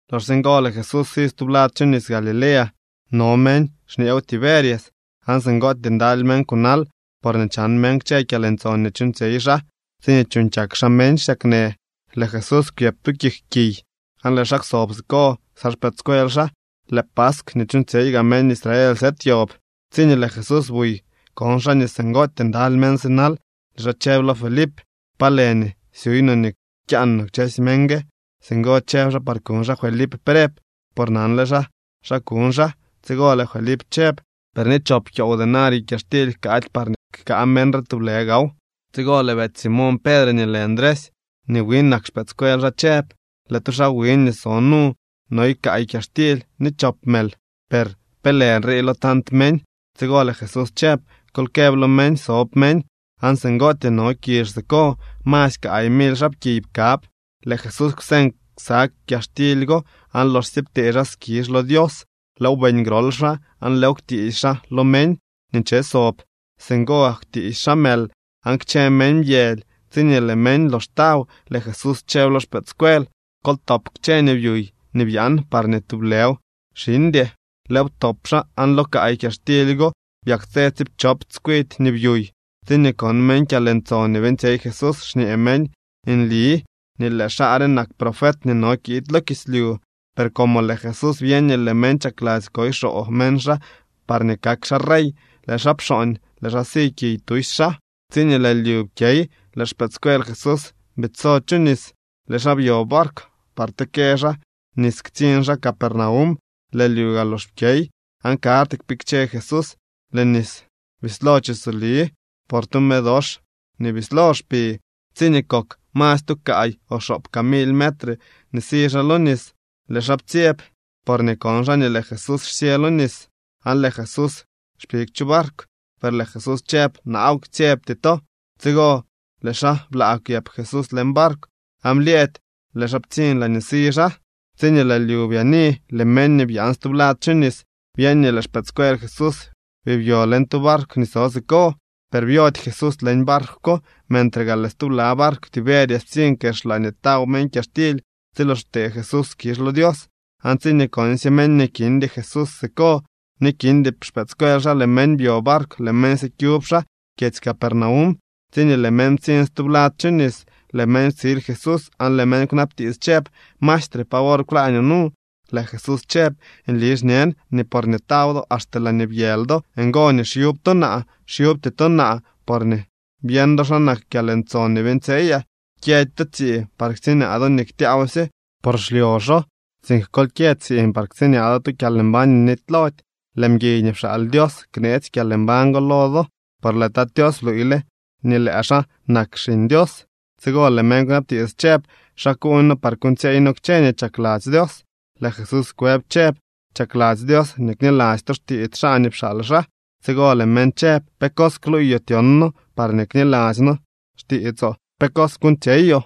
Loxsye ngo, lëë Jesús si stublad chu nis Galilea. No meñ xñeew Tiberias. Aan singootyee ndaly meñ kunal porñee chan meñ kchë kyalntson nii chuuñtsyey xaa tsiñee chuuñ kyak xaa meñ xsyaknë. Lëë Jesús kwyëp tu kik kiy aan lëë xaa kwsob siko ksa xpëëdscuel xaa. Lëë paskw nii chuuñtsyey gaa meñ Israel sëëd yob. Tsiñee lëë Jesús buy, kon xaa nii singootyee ndaly meñ sinal. Lëë xaa chëb lo Felip: —¿Pa lë nii syuuy no nii kyaan no kchësy meñ gue? Singo chëb xaa par kuñ xaa Felip preb, por nanle xaa xa kuñ xaa. Tsigo lëë Felip chëb: —Per ni chop kyoow denario kyaxtily jkaady parñee jkaa meñ re tublë gaaw. Tsigo lëë betsy Simoñ Pedre nii lë Ndresy nii wi nak xpëëdscuel xaa chëb: —Lëë tu xaa wiñ nii so nu noy kaay kyaxtily ni chop mël, per ¿pe lë nrii lo tant meñ? Tsigo lëë Jesús chëb: —Kol këb lo meñ sob meñ. Aan singootyee no kizh siko. Masy kaay mily xaapkiy pkab. Lëë Jesús kwseñ ksa kyaxtily go, aan loxsye ptee xaa skizh lo Dios, lëëw beeñ grol xaa aan lëëw kwtiisy xaa lo meñ nii nche sob. Singo gak kwtiisy xaa mël aan kchë meñ byëly. Tsiñee lëë meñ lox taw, lëë Jesús chëb lo xpëëdscuel: —Kol ktop kchë nii byuy nii byaan parñee ni tublëw xiñdy. Lëëw ptop xaa, aan lo kaay kyaxtily go byaktsë tsiipchop tskwidy nii byuy. Tsiñee kon meñ kyalntson nii beeñtsyey Jesús, xñee meñ: —Nli nii lëë xaa re nak profet nii no kiid lo kislyu. Per como lëë Jesús byeñ nii lëë meñ chakladzy koy xoo meñ xaa parñee kak xaa rey, lëë xaa pxooñ, lëë xaa si kiy tusy xaa. Tsiñee lëë lyu pkyey, lëë xpëëdscuel Jesús biidso chu nis. Lëë xaa byo barkw par tekë xaa nis ktsiñ xaa Capernaum. Lëë lyu gaa lox pkyey, aan karty kpikche Jesús. Lëë nis bislo chisoli por tu me dox nii bislo xpi. Tsiñee kok masy tu kaay o xoop kaa mily metre si xaa lo nis, lëë xaa ptsyeb porñee kon xaa nii lëë Jesús xsyë lo nis aan lëë Jesús xpig chu barkw. Per lëë Jesús chëb: —¡Naaw, ktsyebty to! Tsigo lëë xaa blaa kwyëp Jesús leñ barkw aan blyëëdy lëë xaa ptsiñ laañee si xaa. Tsi lëë lyu byaani, lëë meñ nii byaan stublad chu nis byeñ nii lëë xpëëdscuel Jesús bii byo leñ tu barkw nii so siko, per byody Jesús leñ barkw ko. Mentre gaa lëë stubla barkw Tiberias ptsiñ kex laañee taw meñ kyaxtily tsi lox ptee Jesús skizh lo Dios. Aan tsiñee konsye meñ nii kindy Jesús siko ni kindy xpëëdscuel xaa, lëë meñ byo barkw, lëë meñ sikyub xaa kyedzy Capernaum. Tsiñee lëë meñ ptsiñ stublad chu nis, lëë meñ ptsil Jesús aan lëë meñ kwnabtiits chëb: —Maestre, ¿pa wor kwlaañoo nu? Lëë Jesús chëb: —Nli xñen nii porñee taw do axte laañee byëly do, ngo nii xyub to naa. Xyubty to naa porñee byeñ do xa nak kyalntson nii beeñtsyeyaa. Kyëdy to tsiiñ par ktsiñaa do nii ktyaawsye, por xlyoxo, sink kol kyë tsiiñ par ktsiñaa do tu kyalmbañ nii nitylody. Lëë mguiy nii pxaal Dios kneetsy kyalmbañ go lo do, por lëë Tat Tios bluuyle nii lëë xaa nak Xiñ Dios. Tsigo lëë meñ kwnabtiits chëb: —¿Xa kuuñ noo par kuuñtsyeey noo kchë nii chakladzy Dios? Lëë Jesús kwëb chëb: —Chakladzy Dios nii kniladzy to xtiits xaa nii pxaal xaa. Tsigo lëë meñ chëb: —¿Pe cos kluuyoo tyon noo parñee kniladzy noo xtiitsoo? ¿Pe cos kuuñtsyeyoo?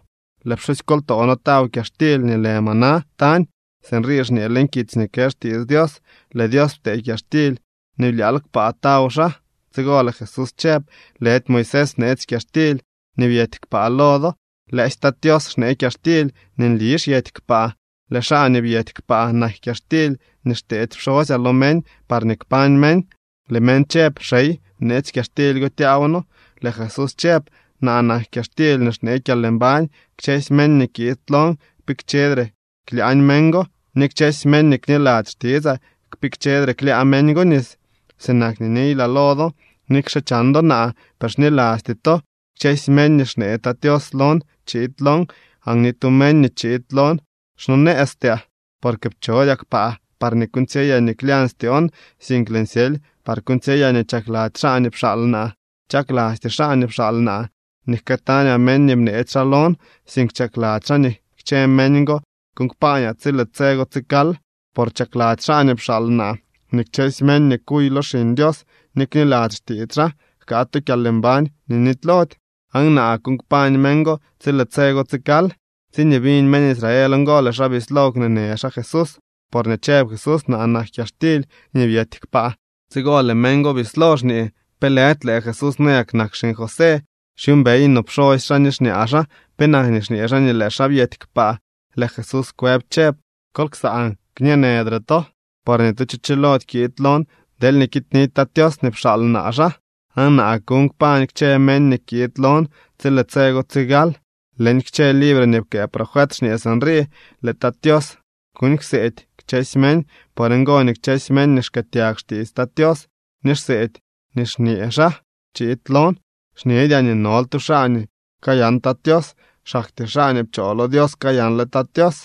Lëë pxusykoltoo noo taw kyaxtily nii lë maná tañ. Sinrii xñee leñ kitsy nii kë xtiits Dios: “Lëë Dios ptee kyaxtily nii blyaal kpaa taw xaa.” Tsigo lëë Jesús chëb: —Lëdy Moisés bneetsy kyaxtily nii byety kpaa lo do. Lëësy Tat Tios xnee kyaxtily nii nli xyety kpaa. Lëë xaa nii byety kpaa nak kyaxtily nii xteedy pxosyaa lo meñ parñee kpañ meñ. Lëë meñ chëb: —Xey, bneetsy kyaxtily go tyaaw noo. Lëë Jesús chëb: —Naa nak kyaxtily nii xnee kyalmbañ. Kchësy meñ nii kiid lon, kpikchedre klyaañ meñ go, ni kchësy meñ nii kniladzy xtitsaa, kpikchedre klyaa meñ go nis. Sinak nii niylaa lo do, nikxe chan do naa, per xnilasty to. Kchësy meñ nii xnee Tat Tios lon chiid lon. Aan ni tu meñ nii chiid lon xsonëëztyaa. Porque pchodyaa kpaa parñee kuuñtsyeyaa nii klyañ styoon, sink lëën syely par kuuñtsyeyaa nii chakladzy xaa nii pxaal naa. Chaklasty xaa nii pxaal naa nii jkëëtañaa meñ nii bneetsy xaa lon, sink chakladzy xaa nii kchë meñ go kuuñ kpaañaa tsi lëë tse go tsigal. Por chakladzy xaa nii pxaal naa nii kchësy meñ nii kuy lo Xiñ Dios ni kniladzy xtiits xaa jkaa tu kyalmbañ nii nitylody. Aan naa kuuñ kpañ meñ go tsi lëë tse go tsigal. Tsiñee biñ meñ Israel ngo, lëë xaa bislo kwneenë xaa Jesús, porñee chëb Jesús: “Naa nak kyaxtily nii byety kpaa.” Tsigo lëë meñ go bislo xñee: —¿Pe lëdy lëë Jesús nayak nak xiñ José? Xyuumbey no pxosy xaa ni xñaa xaa. ¿Penak nii xñee xaa nii lëë xaa byety kpaa? Lëë Jesús kwëb chëb: —Kol ksaan, kñeenëdre to. Por ni tu cho chilody kiid lon deelñee kiidnidy Tat Tios nii pxaal naa xaa. Aan naa kuuñ kpañ kchë meñ nii kiid lon tsi lëë tse go tsigal. Leñ kchë libre nii pkëë profet xñee sinrii: “Lëë Tat Tios kuuñ kseedy kchësy meñ.” Por ngo nii kchësy meñ nii xkëëtyag xtiits Tat Tios, ni xseedy nii xñee xaa, chiid lon. ’Xñedyaa nii nol tu xaa nii kayan Tat Tios. Xaktyee xaa nii pchoo lo Dios kayanle Tat Tios.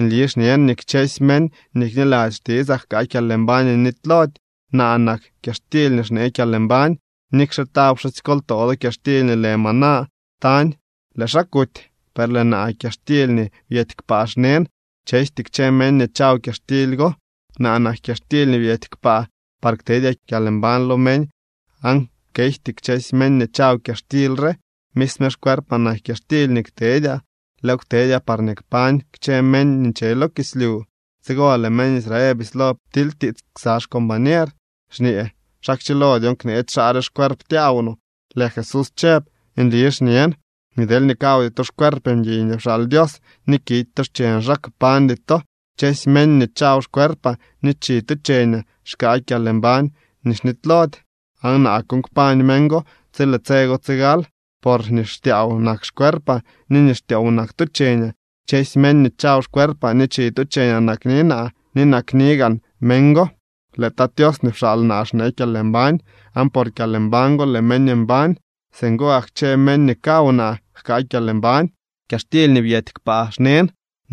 Nli xñen nii kchësy meñ nii kniladzy xtitsaa jkaa kyalmbañ nii nitylody. Naa nak kyaxtily nii xnee kyalmbañ. Nikxe taw pxusykoltoo do kyaxtily nii lë maná tañ, lëë xaa kuty. Per lëë naa kyaxtily nii byety kpaa xnen. Chejty kchë meñ nii chaw kyaxtily go. Naa nak kyaxtily nii byety kpaa par ktedyaa kyalmbañ lo meñ, aan kejty kchësy meñ nii chaw kyaxtily re. Misme xcuerpaa nak kyaxtily nii ktedyaa. Lëëw ktedyaa parñee kpañ kchë meñ nii nche lo kislyu. Tsigo lëë meñ Israel bislo ptilytiits ksa xcombañer, xñee: —¿Xa kchilo dyon kneetsy xaa re xcuerp tyaaw no? Lëë Jesús chëb: —Nli xñen nii deelñee kawdy to xcuerp mguiy nii pxaal Dios ni kidy to xcheñ xaa, kpañdy to. Kchësy meñ nii chaw xcuerpaa ni chi tu cheñaa, xkaa kyalmbañ nii xnitylody, aan naa kuuñ kpañ meñ go tsi lëë tse go tsigal. Por nii xtyaaw nak xcuerpaa, ni nii xtyoow nak tu cheñaa. Kchësy meñ nii chaw xcuerpaa ni chi tu cheñaa nakni naa, ni nakni gaan meñ go. Lëë Tat Tios nii pxaal naa xnee kyalmbañ, aan por kyalmbañ go lëë meñ mbañ. Singo gak kchë meñ nii kaw naa jkaa kyalmbañ. Kyaxtily nii byety kpaa xnen.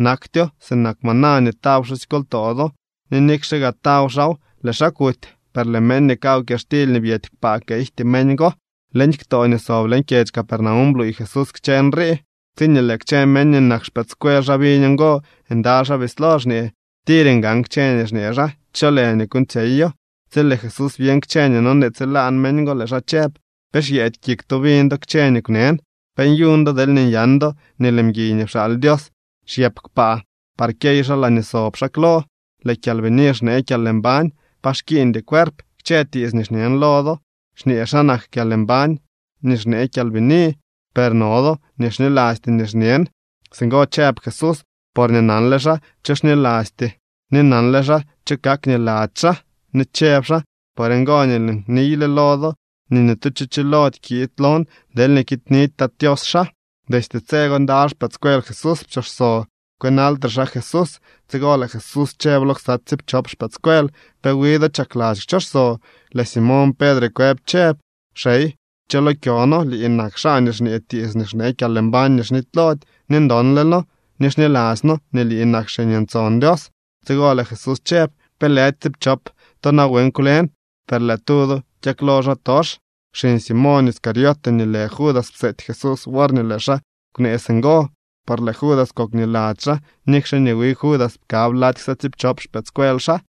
Naktyo sinak maná nii taw pxusykoltoo do ni nikxe gaa taw xaaw, lëë xaa kuty. Per lëë meñ nii kaw kyaxtily nii byety kpaa kejty meñ go. Leñ ktoo nii sob leñ kyedzy Capernaum bluuy Jesús kchë nrii. Tsiñee lëë kchë meñ nii nak xpëëdscuel xaa biñ ngo, ndaly xaa bislo xñee: —Tir ngan kchë nii xñee xaa. ¿Cho lë nii kuuñtsyeyo? Tsi lëë Jesús byeñ kchë nii nonee tsilaan meñ go, lëë xaa chëb: —¿Pe xyeedy kik to biñ do kchë nii kwnen? ¿Pe nyuñ do deelñee nyan do nii lëë mguiy nii pxaal Dios xyëp kpaa par kyey xaa laañee sob xaa klo? Lëë Kyalbini xnee kyalmbañ. Pa xkiiñdy cuerp. Kchë tiits nii xñen lo do xñee xa nak kyalmbañ nii xnee kyalbini. Per no do nii xnilasty nii xñen. Singo chëb Jesús porñee nanle xaa cho xnilasty ni nanle xaa cho kak niladzy xaa. Ni chëb xaa: —Por ngo nii lëën niyle lo do nii ni tu cho chilody kiid lon deelñee kiidnidy Tat Tios xaa. Destye tse go ndaly xpëëdscuel Jesús pchooxso kwënaltre xaa Jesús. Tsigo lëë Jesús chëb lo ksa tsiipchop xpëëdscuel: —¿Pe wi do chakladzy kchooxso? Lëë Simoñ Pedre kwëb chëb: —Xey, ¿cho lo kyo noo? Lii nak xaa nii xñee tiits nii xnee kyalmbañ nii xnitylody. Ni ndonle noo ni xniladzy noo nii lii nak Xiñ Ntson Dios. Tsigo lëë Jesús chëb: —¿Pe lëdy tsiipchop to nawen kwlen? Per lëë tu do byaklo xaatox. Xiñ Simoñ Iscariote nii lë Judas pseety Jesús worñee lëë xaa kwnee singo, por lëë Judas kok niladzy xaa nikxe nii wi Judas pkab lady ksa tsiipchop xpëëdscuel xaa.